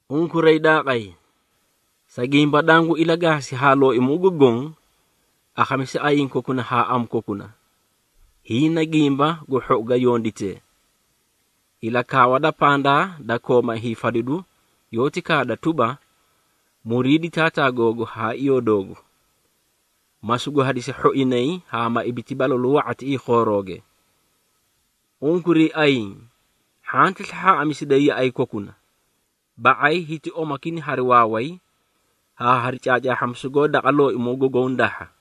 Unkuray daaqay, sa gimba danguũ ilagaasi daqa Looimoo gu Goõ, akhamisa ayiĩ kokuna haa amu kokuna, hiĩ na gimba gu hhou ga yonditee. Ilakaawa da pandaa da kooma hiifadidu yoóti kaada tuba, “Muriidi taataa googu haa iyoo doogu, ma sugu hadisi hhoinay haa ma ibiti balalu wa⁄a tiꞌii khoorooge.” Unkuray ayiĩ, hhanti slahhaaꞌamisiday yaꞌay kokuna. Ba⁄ay hiti omakina hari waaway haa hari caacaahhamisu goó daqa Looimoo gu Goõ dahha.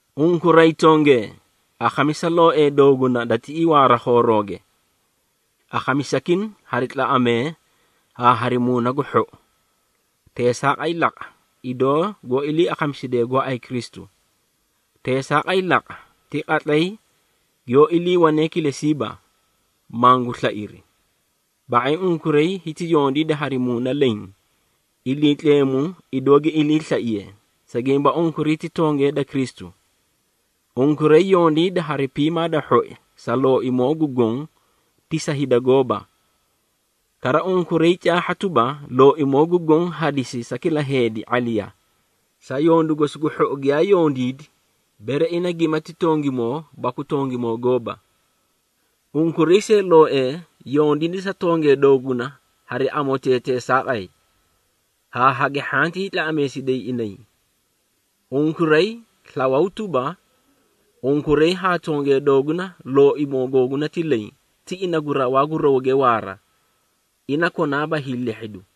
Unkuray tongee, akhamisa looee dooguna da tiꞌii waara khoorooge. Akhamisakina hari tlaꞌamee haa hari muuna gu hhou. Teesaaqay laqa, idoo goó ilii akhamisidee gooay Kristu. Teesaaqay laqa ti qatlay giyoó iliiwanee kilesiiba, mangu slairi. Ba⁄ay unkuray hiti yondiida hari muuna leẽ, Iliitleemu idoo gi iliislaiye, sa gimba unkuray ti tongee da Kristu. Unkuray yondiida hari piimaa da hhoi sa Looimoo gu Goõ ti sa hida gooba. Kara, unkuray caahha tuba, Looimoo gu Goõ hadisi sa kila heedi ⁄aliya, sa yondu gosi gu hhou giyaa yondiidi, bere ina gimati tongimoo baku tongimoo gooba. Unkuray see looee, yondiida sa tongee dooguna hari amotee teesaaqay, haa hagi hhantii tlaꞌameedisiday inay. Unkuray slawaw tuba, unkuray haa tongee dooguna, Looimoo googuna ti leẽ, ti ina gu rawaa gu rawge waaraa, ina konaaba hiilehhidu.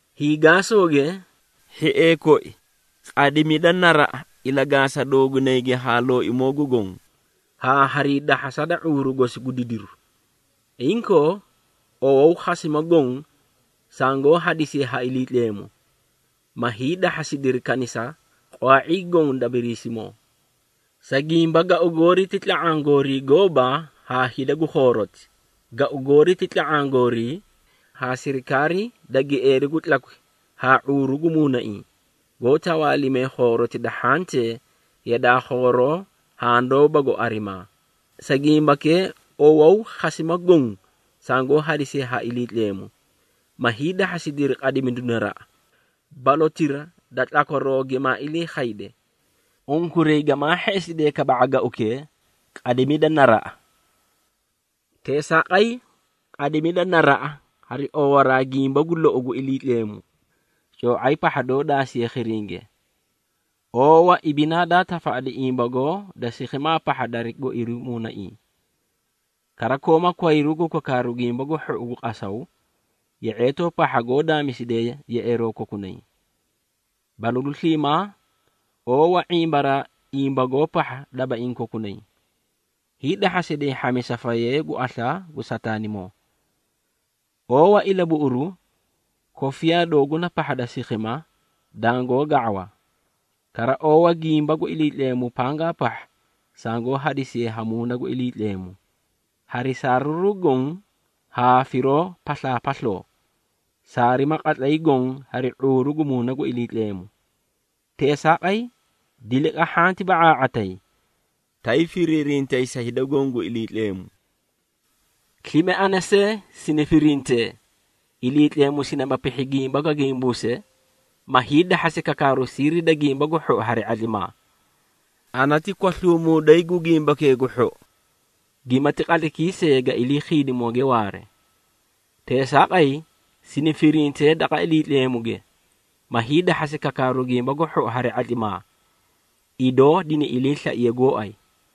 Hiigaasooge, hhiee koi qadimida naraꞌa ilagaasa doogunayge haa Looimoo gu Goõ, haa harii dahhasa da ⁄uuru gosi gu didiru. Inkoo, owawu khasima goõ sangoó hadisiye ha Iliitleemu, ma hiidahhasidiri kanisa qwaa⁄ii goõ da Biriisimoo. Sa gimba gau goori, ti tla⁄aã gooriiba haa hida gu khooroti. Gau goori ti tla⁄aã goorii haa sirikaarii da gieeri gu tlakwi haa ⁄uuru gu muunaiĩ, goó tawaalimee khooroti da hhantee yadaa khooroo handoóbago arimaa. Sa gimbakee, owawu khasima goõ sangoó hadisiye ha Iliitleemu, ma hiidahhasidiri qadimidu naraꞌa, balotira da tlakwaroo gimaa ilii khayde. Unkuray gamaa hheꞌesidee kaba⁄a gaukee, qadimidu naraꞌa. Teesaaqay, qadimida naraꞌa, hari oowaraa gimba gu lou gu Iliitleemu, coo⁄ay pahha doó daasiye khiringe. Oowa ibinaa daa tafaꞌadi imbagoo da sikhima pahha dari goiru muunaiĩ. Kara kooma kwayru gu kakaaru Gimba gu Hhou gu qasaw, ye⁄eetoo pahha goó daamisidee yeꞌeeroo kokunay. Balalu sliimaa oowa ⁄imbaraa imbagoo pahha dabaiĩ kokunay, hiidahhasiday hhamisa fayee gu aslaa gu Sataanimoo. Oowa ilabuꞌuru kofiyaa dooguna pahha da sikhima dangoó ga⁄awa. Kara, oowa gimba gu Iliitleemu pangaa pahha sangoó hadisiye ha Muuna gu Iliitleemu. Hari saariruu goõ haa firoo paslaapasloo, saarima qatlay goõ hari ⁄uuru gu Muuna gu Iliitleemu. Teesaaqay, diliqa hhanti ba⁄aa⁄atayi, tay firiirintay sa hida goõ gu Iliitleemu. Slime ana see sini firintee, Iliitleemu sinima pihhi gimba ga gimbuuse, ma hiidahhasi kakaaru siiri da Gimba gu Hhou hari ⁄atlimaa. Ana ti kwasluumuuday gu Gimbakee gu Hhou, gimati qatlaykii see ga ilii khiidimooge waare. Teesaaqay, sini firintee daqa Iliitleemuge, ma hiidahhasi kakaaru Gimba gu Hhou hari ⁄atlimaa, idoo dini iliislaiye gooay.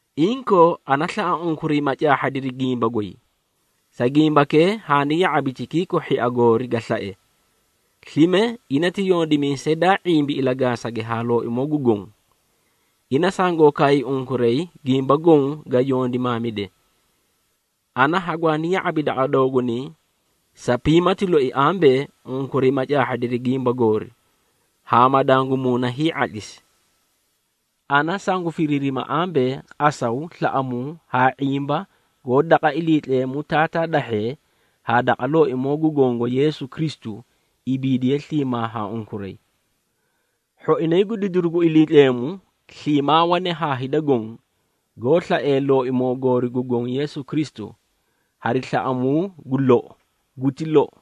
Inkoo, ana slaꞌa unkuray ma caahhadiri gimba goy. Sa gimbakee, haani ya⁄abi Tikiiko hhia goori ga slae, slime ina ti yondimiisay daa ⁄imbi ilagaasage haa Looimoo gu Goõ. Ina sangoo kaay unkuray gimba goõ ga yondimaamide. Ana hagwaani ya⁄abi daqa doogunay sa piimati loi ambee, unkuray ma caahhadiri gimba goori, haa ma dangu muuna hii⁄atlisi. Ana sangu firiirima ambee, qasaw, slaꞌamuu haa ⁄imba goó daqa Iliitleemu Taataa dahhee, haa daqa Looimoo gu Gongo Yeesu Kristu, ibiidiye sliimaa ha unkuray. Hhoinay gu didiru gu Iliitleemu, sliimaa wane haa hida goõ, goó slaee Looimoo goori gu Goõ Yeesu Kristu, hari slaꞌamuu gu lou. Guti lou.